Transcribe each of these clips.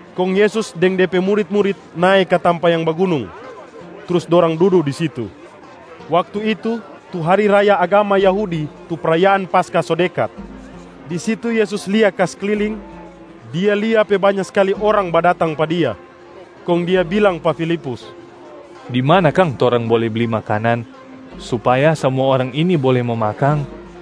Kong Yesus deng De pe murit-murit nae ka tampa yang bagunung, trus dorang dudu di situ. Waktu itu, tu hari raya agama Yahudi tu prayaan Paskah so dekat. Di situ Yesus lia ka sekliling, Dia lia pe banya skali orang badatang pa Dia. Kong Dia bilang pa Filipus, “Di mana kang torang bole bli makanan, supaya samua orang ini bole mo makang?”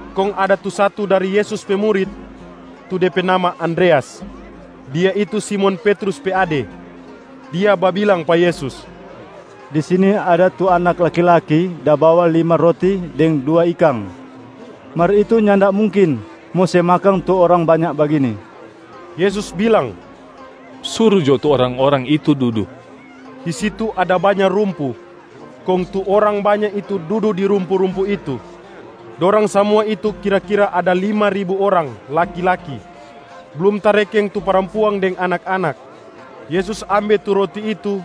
Kong ada tu satu dari Yesus pe murit, tu de pe nama Andreas, dia itu Simon Petrus pe ade. Dia babilang pa Yesus, “Di sini ada tu anak laki-laki da bawa lima roti deng dua ikang. Mar itu nyanda mungkin mo se makang tu orang banya bagini.” Yesus bilang, “Suru jo tu orang-orang itu dudu.” Di situ ada banya rumpu, kong tu orang banya itu dudu di rumpu-rumpu itu. Dorang samua itu kira-kira ada lima ribu orang laki-laki, blum tarekeng tu parampuang deng anak-anak. Yesus ambe tu roti itu,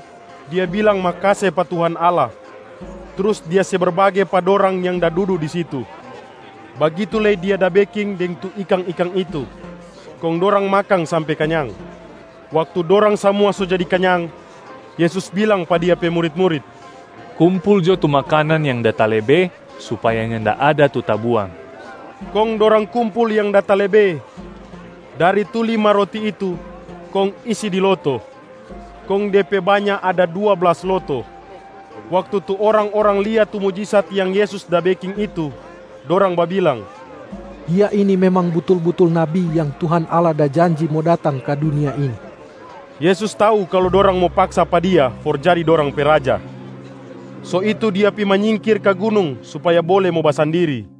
Dia bilang makase pa Tuhan Allah trus Dia se berbage pa dorang yang da dudu di situ. Bagitu lei Dia da beking deng tu ikang-ikang itu, kong dorang makang sampe kanyang. Waktu dorang samua so jadi kanyang, Yesus bilang pa Dia pe murit-murit, “Kumpul jo tu makanan yang da talebe supaya nyanda ada tu tabuang.” Kong dorang kumpul yang da talebe dari tu lima roti itu kong isi di loto, kong de pe banya ada dua blas loto. Waktu tu orang-orang lia tu mujisat yang Yesus da beking itu, dorang babilang, “Dia ini memang butul-butul Nabi yang Tuhan Allah da janji mo datang ka dunia ini.” Yesus tau kalu dorang mo paksa pa Dia for jadi dorang pe raja. So itu Dia pi manyingkir ka gunung supaya bole mo basandiri.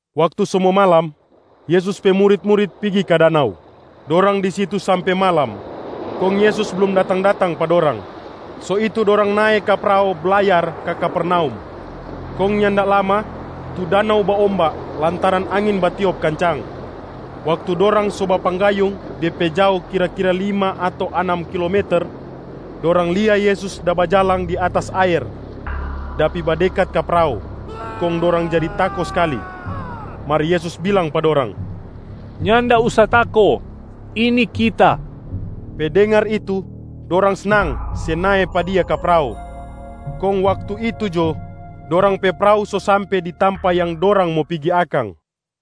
Waktu so mo malam, Yesus pe murit-murit pigi ka danau. Dorang di situ sampe malam kong Yesus blum datang-datang pa dorang, so itu dorang nae ka prao blayar ka Kapernaum. Kong nyanda lama, tu danau baomba lantaran angin batiop kancang. Waktu dorang so bapanggayung de pe jao kira-kira lima ato anam kilometer, dorang lia Yesus da bajalang di atas aer da pi badekat ka prao, kong dorang jadi tako skali. Mar Yesus bilang pa dorang, “Nyanda usa tako! Ini Kita.” Pe dengar itu, dorang snang se nae pa Dia ka prao. Kong waktu itu jo, dorang pe prao so sampe di tampa yang dorang mo pigi akang.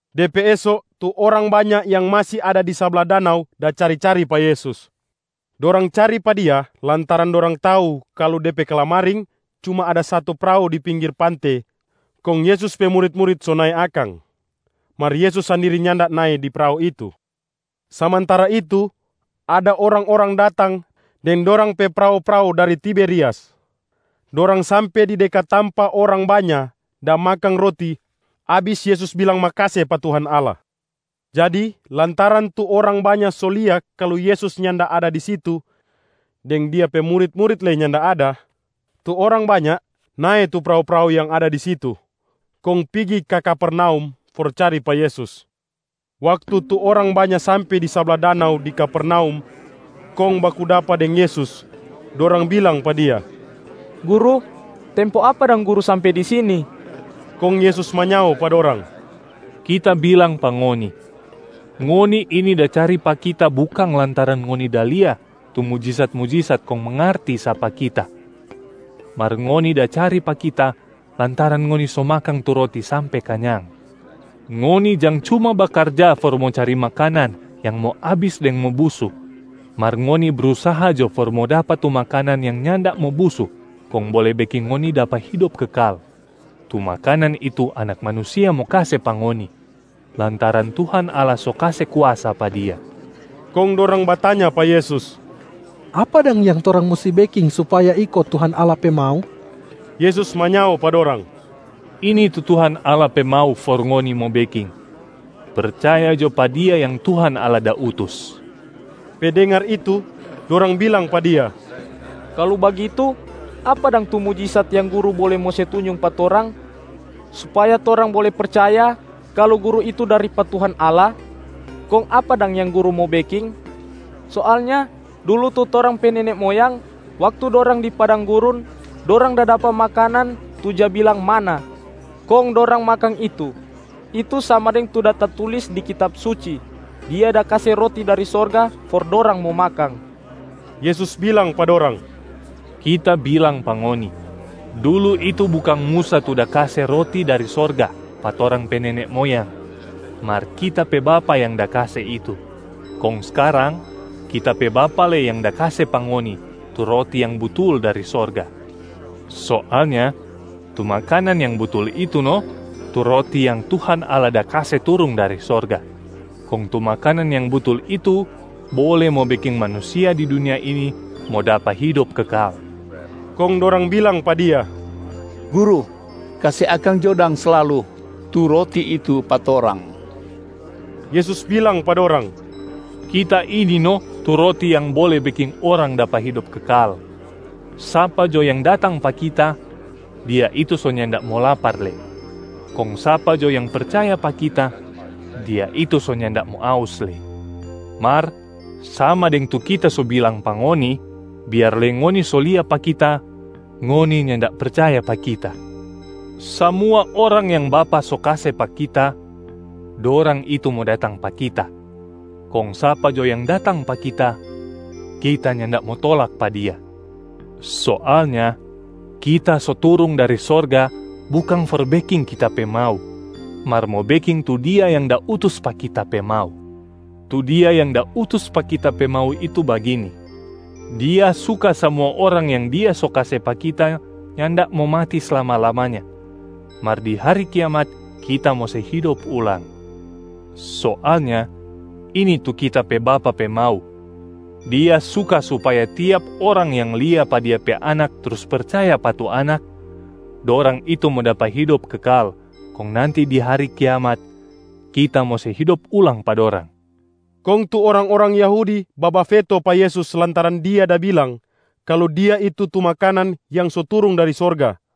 De pe eso, tu orang banya yang masi ada di sabla danau da cari-cari pa Yesus. Dorang cari pa Dia lantaran dorang tau kalu de pe kalamaring cuma ada satu prao di pinggir pante kong Yesus pe murit-murit so nae akang, mar Yesus sandiri nyanda nae di prao itu. Samantara itu, ada orang-orang datang deng dorang pe prao-prao dari Tiberias. Dorang sampe di dekat tampa orang banya da makang roti abis Yesus bilang makase pa Tuhan Allah. Jadi, lantaran tu orang banya so lia kalu Yesus nyanda ada di situ deng Dia pe murit-murit lei nyanda ada, tu orang banya nae tu prao-prao yang ada di situ kong pigi ka Kapernaum for cari pa Yesus. Waktu tu orang banya sampe di sabla danau di Kapernaum kong baku dapa deng Yesus, dorang bilang pa Dia, “Guru, tempo apa dang Guru sampe di sini?” Kong Yesus manyao pa dorang, “Kita bilang pa ngoni, ngoni ini da cari pa Kita bukang lantaran ngoni da lia tu mujisat-mujisat kong mangarti sapa Kita, mar ngoni da cari pa Kita lantaran ngoni so makang tu roti sampe kanyang. Ngoni jang cuma bakarja for mo cari makanan yang mo abis deng mo busu, mar ngoni brusaha jo for mo dapa tu makanan yang nyanda mo busu kong bole beking ngoni dapa hidop kekal. Tu makanan itu Anak Manusia mo kase pa ngoni, lantaran Tuhan Allah so kase kuasa pa Dia.” Kong dorang batanya pa Yesus, “Apa dang yang torang musti beking supaya iko Tuhan Allah pe mau?” Yesus manyao pa dorang, “Ini tu Tuhan Allah pe mau for ngoni mo beking: percaya jo pa Dia yang Tuhan Allah da utus.” Pe dengar itu, dorang bilang pa Dia, “Kalu bagitu, apa dang tu mujisat yang Guru bole mo se tunjung pa torang supaya torang bole percaya kalu Guru itu dari pa Tuhan Allah? Kong apa dang yang Guru mo beking? Soalnya dulu tu torang pe nene moyang, waktu dorang di padang gurun dorang da dapa makanan tu ja bilang manna kong dorang makang itu. Itu sama deng tu da tatulis di Kitab Suci, ‘Dia da kase roti dari sorga for dorang mo makang.’” Yesus bilang pa dorang, “Kita bilang pa ngoni, dulu itu bukang Musa tu da kase roti dari sorga pa torang pe nene moyang, mar Kita pe Bapa yang da kase itu. Kong skarang Kita pe Bapa lei yang da kase pa ngoni tu roti yang butul dari sorga. Soalnya tu makanan yang butul itu no tu roti yang Tuhan Allah da kase turung dari sorga, kong tu makanan yang butul itu bole mo beking manusia di dunia ini mo dapa hidop kekal.” Kong dorang bilang pa Dia, “Guru, kase akang jo dang slalu tu roti itu pa torang.” Yesus bilang pa dorang, “Kita ini no tu roti yang bole beking orang dapa hidop kekal. Sapa jo yang datang pa Kita, dia itu so nyanda mo lapar lei, kong sapa jo yang percaya pa Kita, dia itu so nyanda mo aus lei. Mar sama deng tu Kita so bilang pa ngoni, biar lei ngoni so lia pa Kita, ngoni nyanda percaya pa Kita. Samua orang yang Bapa so kase pa Kita, dorang itu mo datang pa Kita. Kong sapa jo yang datang pa Kita, Kita nyanda mo tolak pa dia. Soalnya, Kita so turung dari sorga bukang for beking Kita pe mau, mar mo beking tu Dia yang da utus pa Kita pe mau. Tu Dia yang da utus pa Kita pe mau itu bagini: Dia suka samua orang yang Dia so kase pa Kita nyanda mo mati slama-lamanya, mar di hari Kiamat Kita mo se hidop ulang. Soalnya ini tu Kita pe Bapa pe mau: Dia suka supaya tiap orang yang lia pa Dia pe Anak trus percaya pa tu Anak, dorang itu mo dapa hidop kekal kong nanti di hari kiamat, Kita mo se hidop ulang pa dorang.” Kong tu orang-orang Yahudi babafeto pa Yesus lantaran Dia da bilang kalu Dia itu tu makanan yang so turung dari sorga.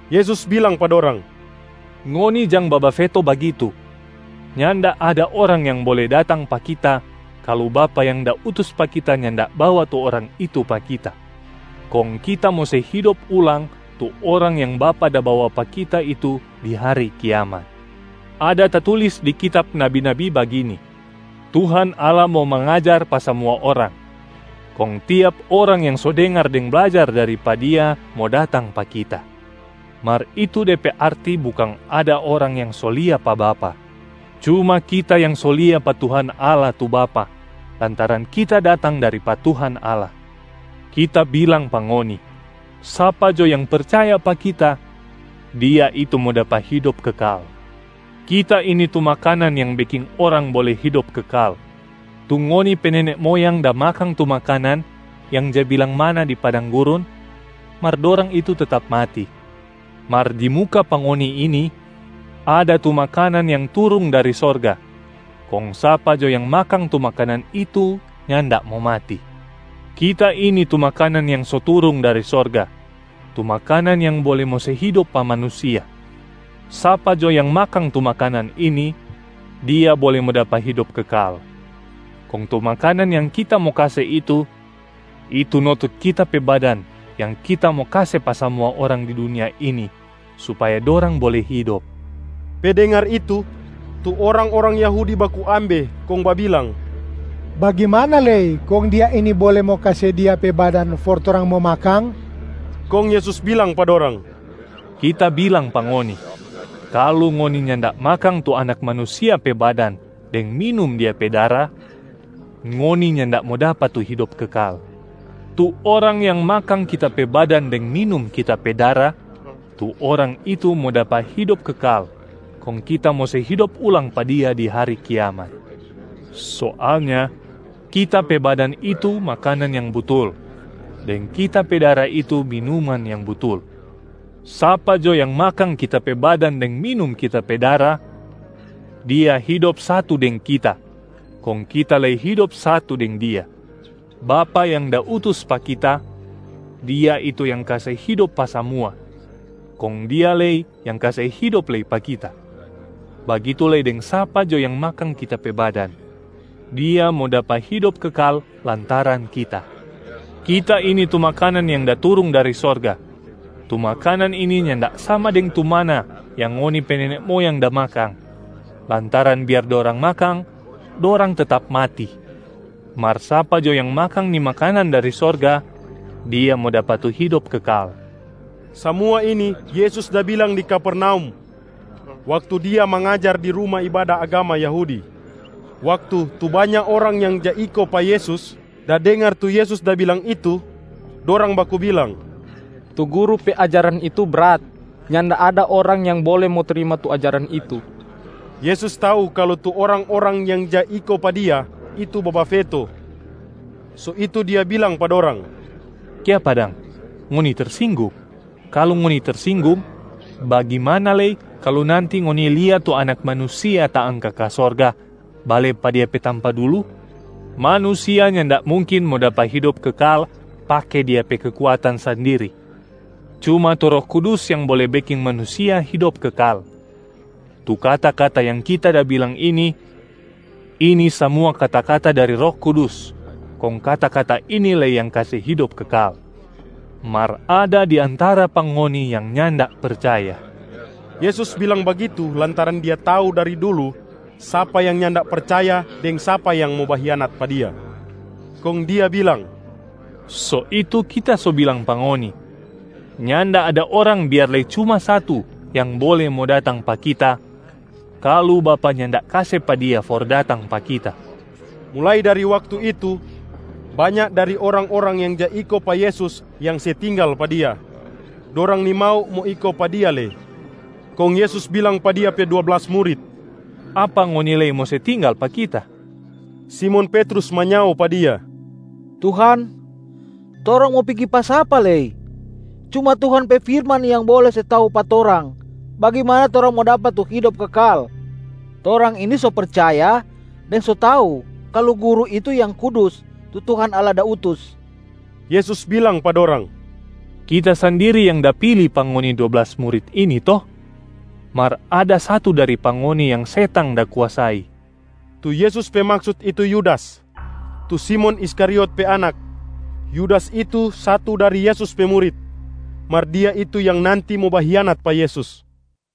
Yesus bilang pa dorang, “Ngoni jang babafeto bagitu. Nyanda ada orang yang bole datang pa Kita kalu Bapa yang da utus pa Kita nyanda bawa tu orang itu pa Kita. Kong Kita mo se hidop ulang tu orang yang Bapa da bawa pa Kita itu di hari Kiamat. Ada tatulis di kitab nabi-nabi bagini, ‘Tuhan Allah mo mangajar pa samua orang.’ Kong tiap orang yang so dengar deng blajar dari pa Dia mo datang pa Kita. Mar itu de pe arti bukang ada orang yang so lia pa Bapa, cuma Kita yang so lia pa Tuhan Allah tu Bapa lantaran Kita datang dari pa Tuhan Allah. Kita bilang pa ngoni, sapa jo yang percaya pa Kita, dia itu mo dapa hidop kekal. Kita ini tu makanan yang beking orang bole hidop kekal. Tu ngoni pe nene moyang da makang tu makanan yang ja bilang manna di padang gurun, mar dorang itu tetap mati. Mar di muka pa ngoni ini ada tu makanan yang turung dari sorga, kong sapa jo yang makang tu makanan itu nyanda mo mati. Kita ini tu makanan yang so turung dari sorga, tu makanan yang bole mo se hidop pa manusia. Sapa jo yang makang tu makanan ini, dia bole mo dapa hidop kekal. Kong tu makanan yang Kita mo kase itu, itu no tu Kita pe badan yang Kita mo kase pa samua orang di dunia ini supaya dorang bole hidop.” Pe dengar itu, tu orang-orang Yahudi baku ambe kong babilang, “Bagimana lei kong Dia ini bole mo kase Dia pe badan for torang mo makang?” Kong Yesus bilang pa dorang, “Kita bilang pa ngoni, kalu ngoni nyanda makang tu Anak Manusia pe badan deng minum Dia pe dara, ngoni nyanda mo dapa tu hidop kekal. Tu orang yang makang Kita pe badan deng minum Kita pe dara, tu orang itu mo dapa hidop kekal kong Kita mo se hidop ulang pa dia di hari Kiamat. Soalnya, Kita pe badan itu makanan yang butul deng Kita pe dara itu minuman yang butul. Sapa jo yang makang Kita pe badan deng minum Kita pe dara, dia hidop satu deng Kita kong Kita lei hidop satu deng dia. Bapa yang da utus pa Kita, Dia itu yang kase hidop pa samua, kong Dia lei yang kase hidop lei pa Kita. Bagitu lei deng sapa jo yang makang Kita pe badan, dia mo dapa hidop kekal lantaran Kita. Kita ini tu makanan yang da turung dari sorga. Tu makanan ini nyanda sama deng tu manna yang ngoni pe nene moyang da makang, lantaran biar dorang makang, dorang tetap mati. Mar sapa jo yang makang ni makanan dari sorga, dia mo dapa tu hidop kekal.” Samua ini Yesus da bilang di Kapernaum waktu Dia mangajar di ruma ibada agama Yahudi. Waktu tu banya orang yang ja iko pa Yesus da dengar tu Yesus da bilang itu, dorang baku bilang, “Tu Guru pe ajaran itu brat. Nyanda ada orang yang bole mo trima tu ajaran itu.” Yesus tau kalu tu orang-orang yang ja iko pa Dia itu babafeto, so itu Dia bilang pa dorang, “Kiapa dang, ngoni tersinggung? Kalu ngoni tersinggung, bagimana lei kalu nanti ngoni lia tu Anak Manusia taangka ka sorga, bale pa Dia pe tampa dulu? Manusia nyanda mungkin mo dapa hidop kekal pake dia pe kekuatan sandiri, cuma tu Roh Kudus yang bole beking manusia hidop kekal. Tu kata-kata yang Kita da bilang ini, ini samua kata-kata dari Roh Kudus kong kata-kata ini lei yang kase hidop kekal. Mar ada di antara pa ngoni yang nyanda percaya.” (Yesus bilang bagitu lantaran Dia tau dari dulu sapa yang nyanda percaya deng sapa yang mo bahianat pa Dia). Kong Dia bilang, “So itu Kita so bilang pa ngoni, nyanda ada orang biar lei cuma satu yang bole mo datang pa Kita, kalu Bapa nyanda kase pa dia for datang pa Kita.” Mulai dari waktu itu, banya dari orang-orang yang ja iko pa Yesus yang se tinggal pa Dia, dorang nimau mo iko pa Dia lei. Kong Yesus bilang pa Dia pe dua blas murit, “Apa ngoni lei mo se tinggal pa Kita?” Simon Petrus manyao pa Dia, “Tuhan, torang mo pigi pa sapa lei? Cuma Tuhan pe firman yang bole se tau pa torang bagimana torang mo dapa tu hidop kekal. Torang ini so percaya deng so tau kalu Guru itu Yang Kudus tu Tuhan Allah da utus.” Yesus bilang pa dorang, “Kita sandiri yang da pili pa ngoni dua blas murit ini to? Mar ada satu dari pa ngoni yang setang da kuasai.” Tu Yesus pe maksut itu Yudas, tu Simon Iskariot pe anak. Yudas itu satu dari Yesus pe murit, mar dia itu yang nanti mo bahianat pa Yesus.